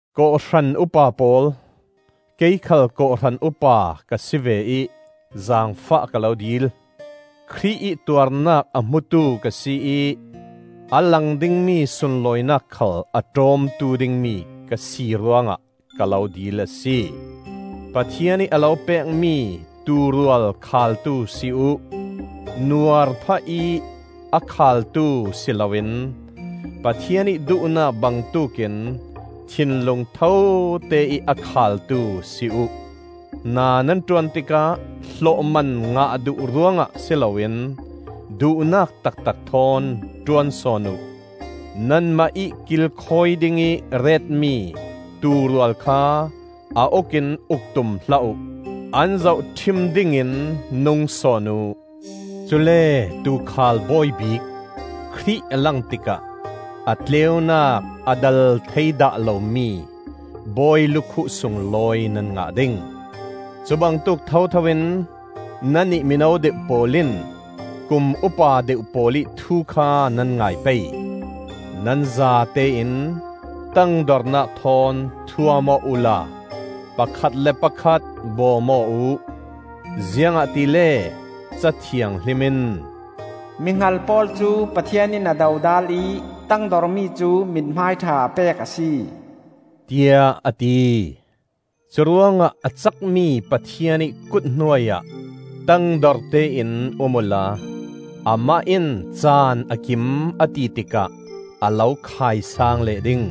Kawhhran upa pawl, kei khal kawhhran upa ka si ve ih, zaangfah ka lo dil. Khrih ih tuarnak a hmutu ka si ih a lang dingmi sunlawinak khal a ṭawmtu dingmi ka si ruangah ka lo dil a si. Pathian ih a lo pekmi tuurual khaaltu si uh; nuar phahih a khaaltu si loin Pathian ih duhnak bangtuk in thinlung thote ih a khaaltu si uh. Hna nan ṭuan tikah hlawhman ngah duh ruangah si loin duhnak taktak thawn ṭuan sawn uh. Nanmah ih kilkhawi dingih retmi tuurual kha a uk in uk tum hlah uh; an zohṭhim dingin nung sawn uh. Cule Tuukhal Bawi Bik Khrih a lang tikah a tleunak a dal thei dah lomi bawi lukhuh sunglawi nan ngah ding. Cubangtuk thothoin nannih mino deuh pawl in kum upa deuh pawl ih thu kha nan ngai pei. Nan zatein tangdornak thawn thuam aw uhla pakhat le pakhat bawm aw uh. Ziangahtile Ca Thianghlim in, “Mi hngal pawl cu Pathian in a dodal ih tangdormi cu mithmai ṭha a pek a si,” tiah a ti. Curuangah a cakmi Pathian ih kut hnuai ah tangdorte in um uhla amah in caan a kim a ti tikah a lo khaisaang leh ding.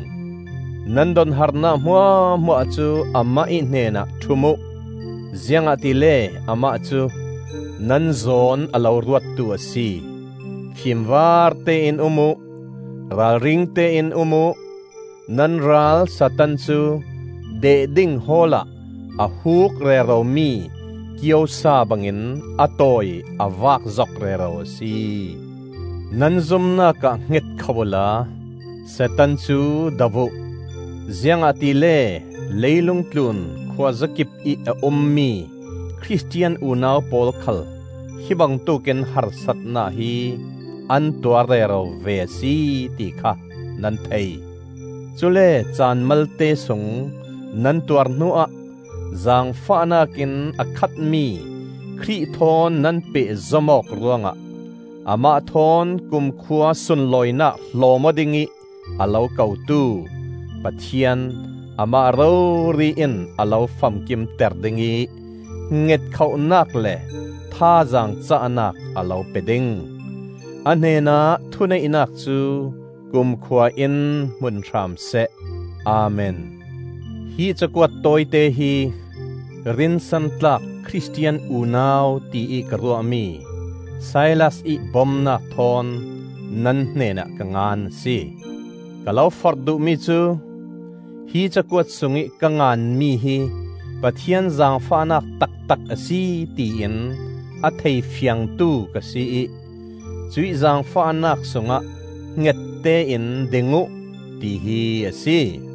Nan donharnak hmuahhmuah cu Amah ih hnenah ṭhum uh, ziangahtile Amah cu nan zawn a lo ruattu a si. Fimvarte in um uh! Ralringte in um uh! Nan ral Satan cu deh ding hawl ah a huuk reromi kiosa bangin a tawi a vak zok rero a si. Nan zumnak ah hngetkhoh uhla Satan cu do uh, ziangahtile leilung tlun khuazakipih a ummi Khristian unau pawl khal hi bangtuk in harsatnak hi an tuar rero ve a si ti kha nan thei. Cule caan malte sung nan tuar hnuah zaangfahnak in a khatmi Khrih thawn nan pehzom awk ruangah amah thawn kumkhua sunlawinak hlawm aw dingih a lo kotu Pathian Amah rori in a lo famkimter ding ih hngetkhohnak le thazaang cahnak a lo pe ding. A hnenah thuneihnak cu kumkhua in hmun hram seh. Amen. Hi cakuat tawite hi rinsantlak Khristian unau tiih ka ruahmi Silas ih bomnak thawn nan hnenah ka ngan a si. Ka lo forh duhmi cu: hi cakuat sungih ka nganmi hi Pathian zaangfahnak taktak a si tiin a thei fiangtu ka si ih cuih zaangfahnak sungah hngette in ding uh, tihi a si.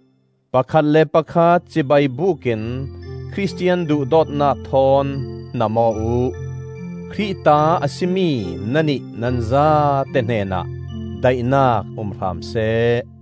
Pakhat le pakhat cibai bukin Khristian duhdawtnak thawn hnam aw uh. Khrih ta a si mi nannih nan zate hnenah daihnak um hram seh.